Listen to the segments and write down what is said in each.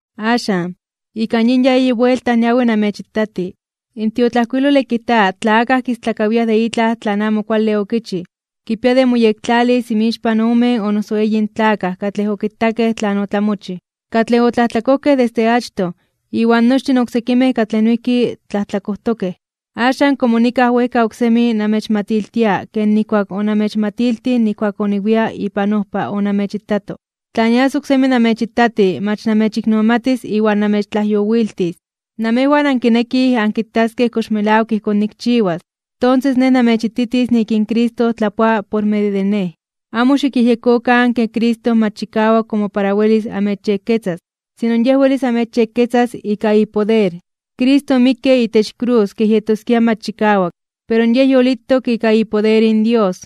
Axan, ika yin ya eyi buelta niawi namechitati. In tiotlajkuilole kijta tla akaj kistlakawiaj de itlaj tlan amo kuale okichij kipia de moyektlalis inmixpan omen o noso eyin tlakaj katlej okitakej tlan otlamochij. Katlej otlajtlakojkej desde achtoj, iwan nochtin oksekimej katlej noijki tlajtlakojtokej, axan komo nikaj wejka oksemi namechmatiltia ken nijkuak onamechmatiltij nijkuak oniwia ipan ojpa onamechitato: tla nias oksemi namechitati mach namechiknomatis iwan namechtlajyowiltis. Namejwan ankinekij ankitaskej kox melawak ijkón nikchiwas, tonses nej namechititis nik in Cristo tlapoa por medio de nej. Amo xikyejyekokan ke Cristo mach chikawak komo para welis amechyekketzas, sino Yej welis amechyekketzas ika ipoder. Cristo omikke itech krus kej yetoskia mach chikawak, pero Yej yolitok ika ipoder in Dios.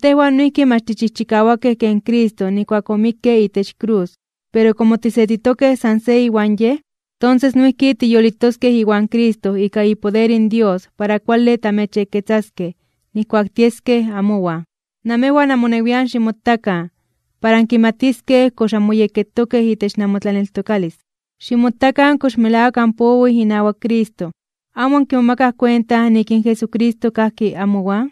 Tejwan noijki mach tichijchikawakej ken Cristo nijkuak omikke itech krus. Pero komo tisetitokej san se iwan Yej, tonses noijki tiyolitoskej iwan Cristo ika ipoder in Dios para kuale tamechyekketzaskej nijkuak tieskej amowan. Namejwan amonewian ximotakan, para ankimatiskej kox anmoyekketokej itech namotlaneltokalis, ximotakan kox melawak anpowij inawak Cristo. ¿Amo ankimomakaj kuenta nik in Jesucristo kajki amowan?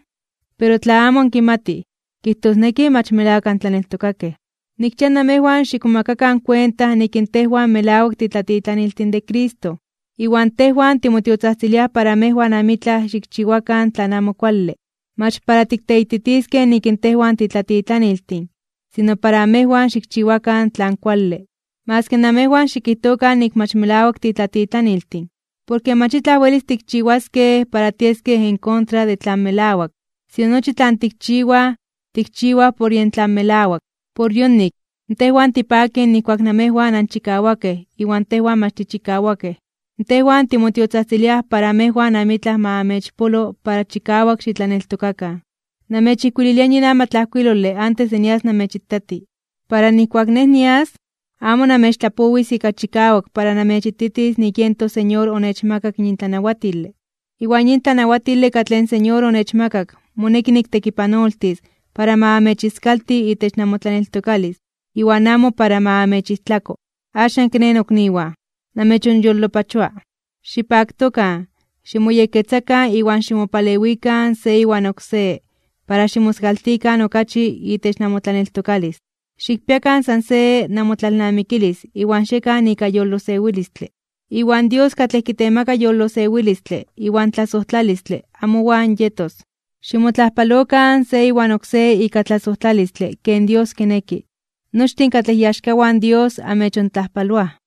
Pero tla amo ankimatij, kijtosneki mach melawak antlaneltokakej. Nikchia namejwan xikmomakakan kuenta nik in tejwan melawak titlatitlaniltin de Cristo. Iwan tejwan timotiotzajtziliaj para namejwan amitlaj xikchiwakan tlan amo kuale, mach para tikteititiskej nik in tejwan titlatitlaniltin, sino para namejwan xikchiwakan tlan kuale. Maski namejwan xikijtokan nik mach melawak titlatitlaniltin. Porke mach itlaj welis tikchiwaskej para tieskej en contra de tlan melawak, sino nochi tlan tikchiwaj, tikchiwaj por yen tlan melawak. Por yonik, tejwan tipakij nijkuak namejwan anchikawakej iwan tejwan mach tichikawakej. Tejwan timotiotzajtziliaj para amejwan amitlaj ma amechpolo para chikawak xitlaneltokakan. Namechijkuililia yin amatlajkuilole antes de nias namechitati, para nijkuak nej nias, amo namechtlapowis ika chikawak para namechititis nik yen toSeñor onechmakak yin tlanawatile. Iwan yin tlanawatile katlej in Señor onechmakak moneki niktekipanoltis para ma amechiskalti itech namotlaneltokalis iwan amo para ma amechijtlako. Axan kiné, nokniwan, namechonyolopachoa. Xipaktokan, ximoyekketzakan iwan ximopalewikan se iwan oksé para ximoskaltikan okachi itech namotlaneltokalis. Xikpiakan san se namotlalnamikilis iwan xiekan ika yolosewilistle. Iwan Dios katlej kitemaka yolosewilistle iwan tlasojtlalistle amowan yetos. Ximotlajpalokan se iwan oksé ika tlasojtlalistle ken Dios kineki. Nochtin katlej iaxkawan Dios amechontlajpaloaj.